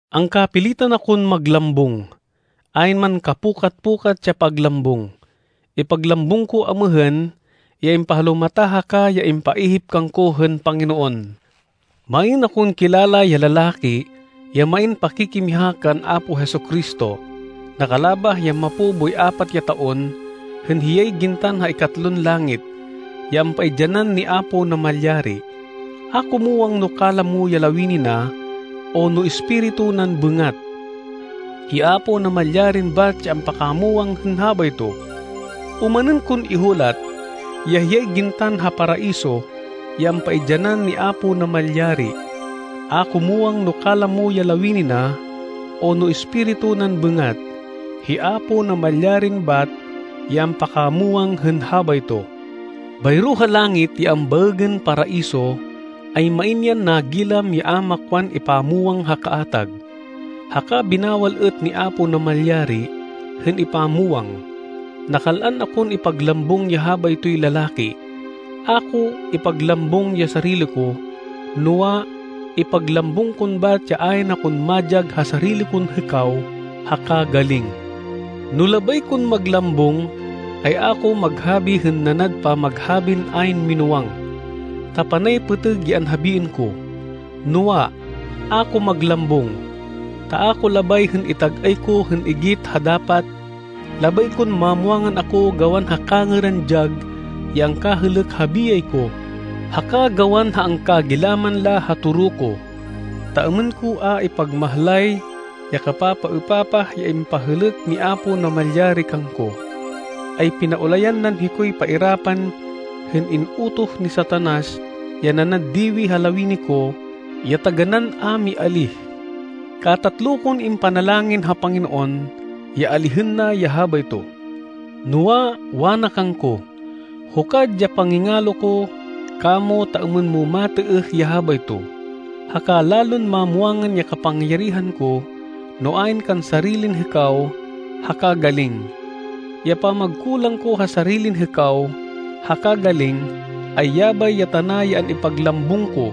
Angkapilitan akon maglambung, ayn man kapukat-pukat ya paglambung. Ipaglambung ko amêhên, ya impahalumata haka ya impaihip kangko hên Panginoon. Main akon kilala ya lalaki ya main pakikimiha kan Apo Jesu-Cristo. Nakalabah ya mapo boy apat ya taon hên hiyay gintan ha ikatlon langit, ya ampaidyanan ni Apo Namalyari. A ko muwang no kalamo ya lawini na o no espiritu nan bêngat. Hi Apo Namalyarin bat ya ampakamwang hên habayto. Omanên kon ihulat, ya hiyay gintan ha Paraiso, ya ampaidyanan ni Apo Namalyari. A ko muwang no kalamo ya lawini na o no espiritu nan bêngat. Hi Apo Namalyarin bat ya ampakamwang hên habayto. Bayro ha langit ya ambaêgên Paraiso, ay main yan nagilam ya a makwan ipamwang ha kaatag, haka binawal êt ni Apo Namalyari hên ipamwang. Nakal-an akon ipaglambung ya habaytoy lalaki. A ko ipaglambung ya sarili ko, noa, ipaglambung kon bat ya ayn akon madyag ha sarili kon hêkaw haka galing. No labay kon maglambung, ay a ko maghabi hên nanad pamaghabin ayn minúwang, ta panay pêtêg ya anhabiên ko. Noa, a ko maglambung, ta a ko labay hên itag-ay ko hên igit ha dapat. Labay kon mamwangan ako gawan ha kangêran dyag ya angkahêlêk ha biyay ko haka gawan ha angkagilaman la ha toro ko. Ta êmên ko a ipagmahlay ya kapapaêpapah ya impahêlêk ni Apo Namalyari kangko, ay pinaulayan nan hikoy pairapan hên in-utoh ni Satanas ya nanad diwi ha lawini ko ya taganán a mialíh. Katatlo kon impanalangin ha Panginoon ya alihên na ya habayto. Noa, wana kangko, “Hukad ya pangingalo ko kamo ta êmên mo matêêh ya habayto, haka lalon mamwangan ya kapangyarihan ko no ayn kan sarilin hêkaw haka galing.” Ya pamagkulang ko ha sarilin hêkaw haka galing, ay yabay ya tana ya an-ipaglambung ko,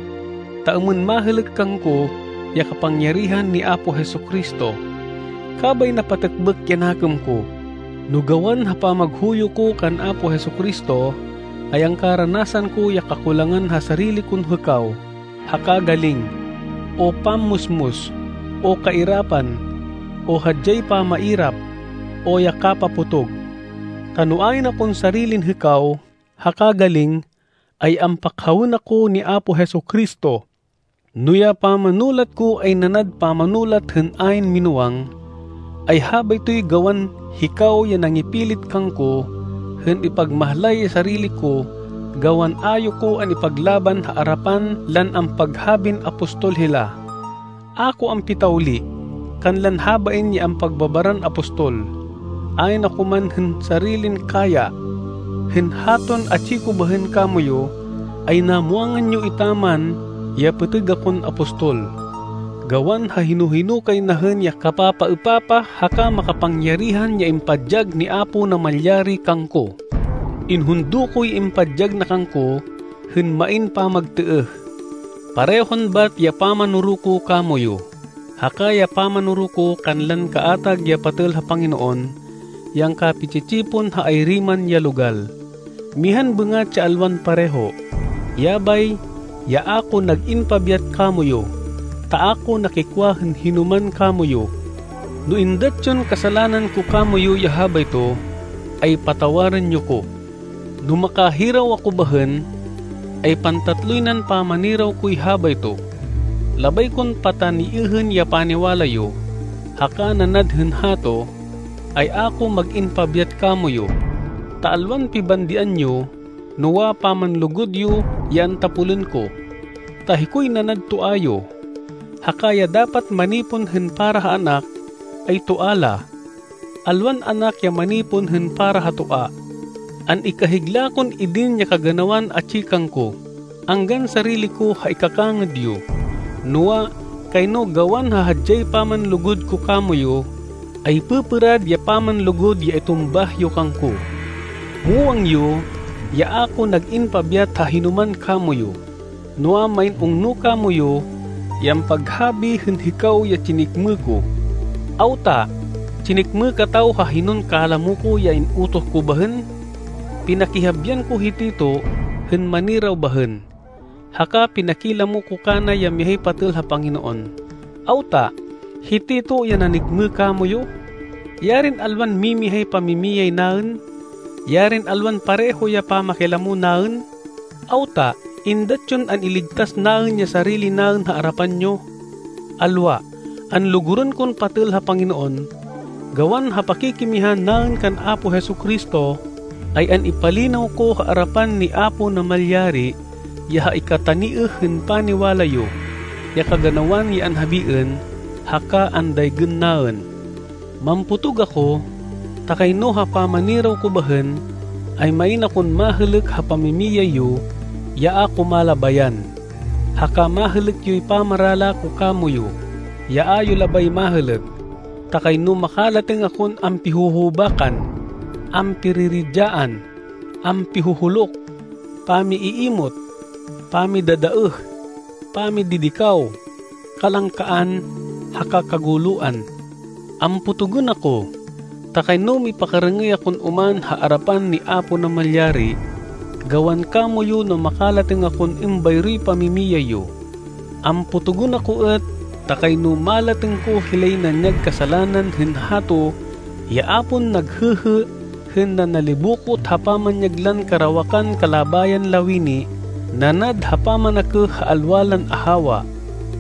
ta êmên mahêlêk kangko ya kapangyarihan ni Apo Jesu-Cristo. Kabay napatêkbêk ya nakêm ko, no gawan ha pamaghuyo ko kan Apo Jesu-Cristo, ay angkaranasan ko ya kakulangan ha sarili kon hêkaw haka galing, o pammusmus, o kairapan, o hadyay pamairap, o ya kapapotog. Ta no ayn akon sarilin hêkaw haka galing, ay ampakhawên ako ni Apo Jesu-Cristo. No ya pamanulat ko ay nanad pamanulat hên ayn minúwang, ay habaytoy gawan hikaw ya nangipilit kangko hên ipagmahlay ya sarili ko gawan a yo ko an-ipaglaban ha arapan lan ampaghabin apostol hila. A ko ampitawli kanlan habain ya ampagbabaran apostol, ayn ako man hên sarilin kaya. Hên haton atsi ko bahên kamoyu, ay namwangan yo etaman ya pêtêg akon apostol, gawan ha hino-hino kay na hên ya kapapaêpapah haka makapangyarihan ya impadyag ni Apo Namalyari kangko. Inhundo koy impadyag na kangko hên main pamagtêêh. Parehon bat ya pamanoro ko kamoyu, haka ya pamanoro ko kanlan kaatag ya patêl ha Panginoon ya angkapi-tsi-tsipon ha ayri man ya logal. Mihan bêngat ya alwan pareho, yabay ya a ko nag-in pabyat kamoyu ta a ko nakikwa hên hinoman kamoyu. No êndat yon kasalanan ko kamoyu ya habayto, ay patawarên yo ko. No makahiraw ako bahên, ay pantatloy nan pamaniraw koy habayto. Labay kon pataniêhên ya paniwala yo, haka nanad hên hato, ay a ko mag-in pabyat kamoyu, ta alwan pibandian yo, noa, pamanlugud yo ya antapolên ko. Ta hikoy nanad toa yo, haka ya dapat manipon hên para ha anak, ay toa la, alwan anak ya manipon hên para ha toa. An-ikahigla kon idin ya kaganawan atsi kangko, anggan sarili ko ha ikakangêd yo. Noa, kayno gawan ha hadyay pamanlugud ko kamoyu, ay pêpêrad ya pamanlugud ya itumbah yo kangko! Muwang yo ya a ko nag-in pabyat ha hinoman kamoyu. Noa, main ungno kamoyu ya ampaghabi hên hikaw ya tsinêkmê ko. Awta? Tsinêkmê kataw ha hinon kalamo ko ya in-utoh ko bahên? Pinakihabian ko hi Tito hên maniraw bahên, haka pinakilamo ko kana ya mihay patêl ha Panginoon. Awta? Hi Tito ya nanêkmê kamoyu? Yarin alwan mimihay pamimiyay naên! Yarin alwan pareho ya pamakilamo naên! Awta? Êndat yon an-iligtas naên ya sarili naên ha arapan yo? Alwa! Anlugurên kon patêl ha Panginoon, gawan ha pakikimiha naên kan Apo Jesu-Cristo, ay an-ipalinaw ko ha arapan ni Apo Namalyari ya ha ikataniêh hên paniwala yo ya kaganawan ya anhabiên, haka andaygên naên. Mampotog ako ta kayno ha pamaniraw ko bahên, ay main akon mahêlêk ha pamimiyay yo ya a ko malabayan, haka mahêlêk yoy pamarala ko kamoyu, ya a yo labay mahêlêk. Ta kayno makalatêng akon ampihuhubakan, ampiriridyaan, ampihuhuluk, pami-iimot, pamidadaêh, pamididikaw, kalangkaan, haka kaguloan. Ampotogên ako ta kayno mipakarêng-êy akon oman ha arapan ni Apo Namalyari gawan kamoyu no makalatêng akon êmbayroy pamimiyay yo. Ampotogên ako êt ta kayno malatêng ko hilay nanyag kasalanan hên hato ya a pon naghêhê hên nanalibokot ha pamanyag lan karawakan kalabayan lawini nanad ha pamanakêh ha alwa lan ahawa,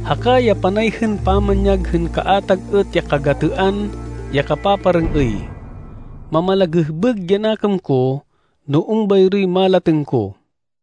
haka ya panay hên pamanyag hên kaatag êt ya kagatêan ya kapaparêng-êy. Mamalagêhbêg ya nakêm ko no êmbayroy malatêng ko.